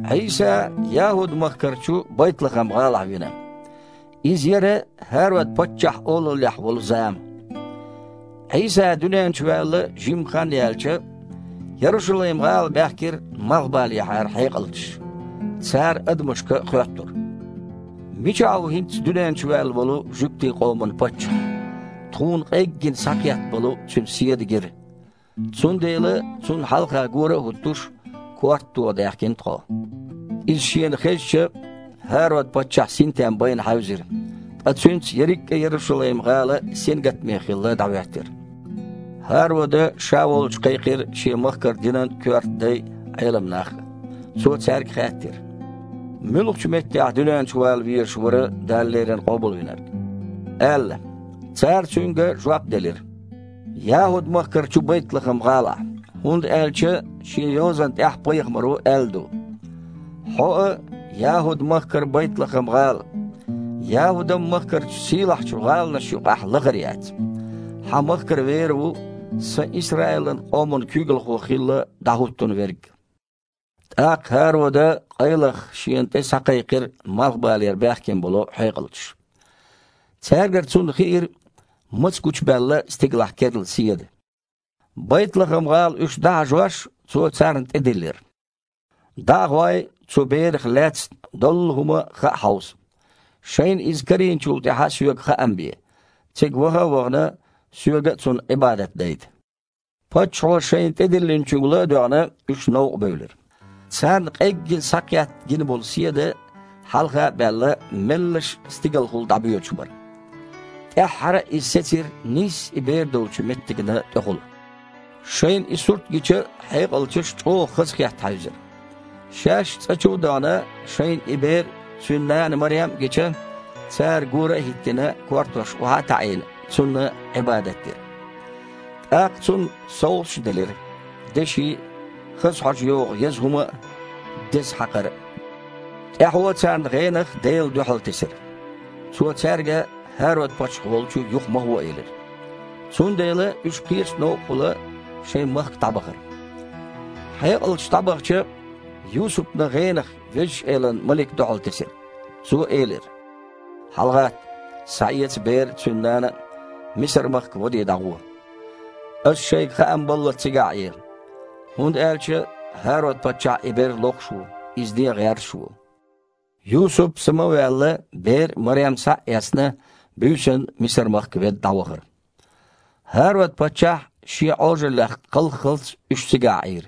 Іийса ЯхІуд-махкарчу Байтлахам-гІалахь вина. Иза яра ХІарод-паччахь олаллехь волу зама. Іийса дуьнен чу ваьлла жимма хан яьлча, Ярушалайм-гІала баьхкира малхбалехьара хьекъалчаш. Цара адамашка хоьттура: «Мичахь ву хІинцца дуьнен чу ваьлла волу жуьгтийн къоман паччахь? Тхуна къеггина схьакхетта болу Цуьнан седа гира. Цундела, Цунна хьалха гора а хІуттуш, корта тоха даьхкина тхо». Иза шена хезча, ХІарод-паччахь синтем байна хьаьвзира, ткъа цуьнца ерриг а Ярушалайм-гІала сингаттаме хилла дІахІоьттира. ХІарода ша волчу кхайкхира шен махкара динан коьрта дай а, Іелам нах а. Цо цаьрга хаьттира: «Муьлхачу меттехь дуьнен чу вала везаш вара Дала леррина Къобалвинарг?» – аьлла. Цара цуьнга жоп делира: «ЯхІуд-махкарчу Байтлахам-гІалара, хІунда аьлча шен йозанна тІехь пайхамаро аьлла ду: „Хьо а, ЯхІуд-махкара Байтлахам-гІала, ЯхІудан махкарчу сийлахьчу гІаланаш юкъахь лахара яц. Хьан махкара вер ву Сан Исраилан къоман куьйгалхо хилла дІахІуттун верг!“» ТІаккха ХІарода къайлаха шена тІе схьакхайкхира малхбалера баьхкина болу хьекъалчаш. Цаьргара цунна хиира, маца гучубаьлла стигалахь керла седа. Байтлахам-гІала уьш дІахьажош, цо царна тІедиллира: «ДІа а гІой, цу берах лаьцна доллу хІума а хаа хьовса. Шайна иза карийначул тІаьхьа соьга хаам бе, цига ваха а вахана, соьга а Цунна Іибадат дайта». Паччахьо шайна тІедиллиначуьнга ла а доьгІна, уьш новкъа бевлира. Царна къеггина схьакхетта гина болу седа, хьалха а баьлла, меллаша стигалахула дІабоьдуш бара. ТІаьххьара а иза сецира нийсса и бер долчу меттигна тІехула. Шайна и сурт гича, хьекъалчаш чІогІа хазахетта хьаьвзира. Шаьш цІа чу а дахана, шайна и Бер а, Цуьнан нана Марем а гича, цара, гора а хІиттина, кортош охьа а таІийна, Цунна Іибадат дира. ТІаккха Цунна совгІаташ а делира: деши а, хаза хьожа йогІу еза хІума а, деза хьакхар а. ТІаьхьо царна гІенах Дела дуьхьалтесира. Цо цаьрга ХІарод-паччахь волчу юха ма гІо элира. Цундела уьш кхечу новкъахула шайн махка дІабахара. Хьекъалчаш дІабахча, Юсупана гІенах Везачу Элан малик дуьхьалтесира. Цо элира: «ХьалагІатта, схьаэца бер а, цуьнан нана а, Мисар-махка, вадий, дІагІо. Аса шайга хаам баллалц цигахь Іе, хІунда аьлча ХІарод-паччахь и бер лохуш ву, иза ден гІерташ а ву». Юсуп, сама а ваьлла, бер а, Марем а схьа а эцна, буьйсанна Мисар-махка ведда дІавахара. ХІарод-паччахь шен Іожаллех кхалххалц, уьш цигахь Іийра.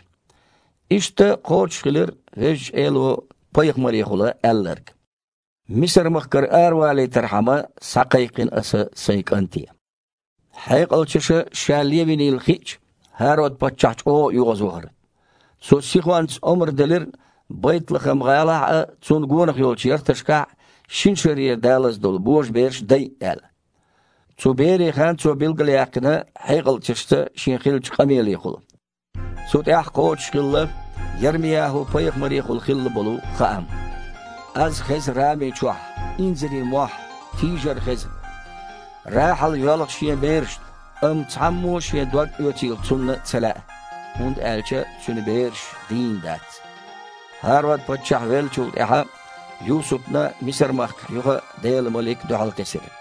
Иштта кхочушхилира Везачу Эло пайхамарехула аьлларг: «Мисар-махкара аравалийтархьама схьакхайкхина Аса Сайн кІанте». Хьекъалчаша ша левинийла хиъча, ХІарод-паччахь чІогІа оьгІазвахара. Цо сихонца омра делира, Байтлахам-гІалахь а, цунна гонах йолчу ярташкахь а шина шарера далаза долу божабераш дайа аьлла. Цу берийн хан цо билгалъяьккхина хьекъалчашца шен хиллачу къамелехула. Цу тІехь кхочушхилла Ярми-ЯхІу-пайхамарехула хилла болу хаам: «Аьзнаш хеза Рами чохь, инзаре маьхьарий, тийжарш хеза. Рахьал йоьлху шен берашна, амма цхьаммо а шен дог оьцийла цунна ца лаьа, хІунда аьлча цуьнан бераш дийна дац». ХІарод-паччахь веллачул тІаьхьа Юсупана Мисар-махкахь юха а Делан малик дуьхьалтесира.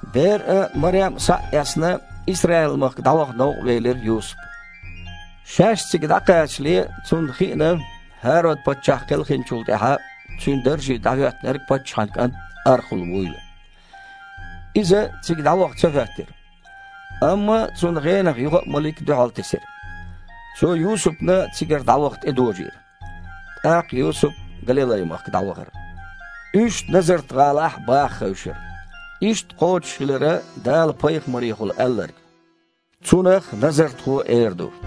Бер а, Марем а схьа а эцна, Исраил-махка дІаваха новкъа велира Юсуп. Шаьш цига дІакхачале, цунна хиъна, ХІарод-паччахь кхелхинчул тІаьхьа цуьнан дарже дІахІоьттинарг паччахьан кІант Архул вуйла. Иза цига дІаваха ца хІоьттира. Амма цунна гІенах юха а малик дуьхьалтесира. Цо Юсупана цигара дІаваха тІедожийра. ТІаккха Юсуп Галилай-махка дІавахара. Уьш Назарт-гІалахь бāха хевшира. Иштта кхочушхилира Дала пайхамарехула аьлларг: «Цунах назархо эр ду».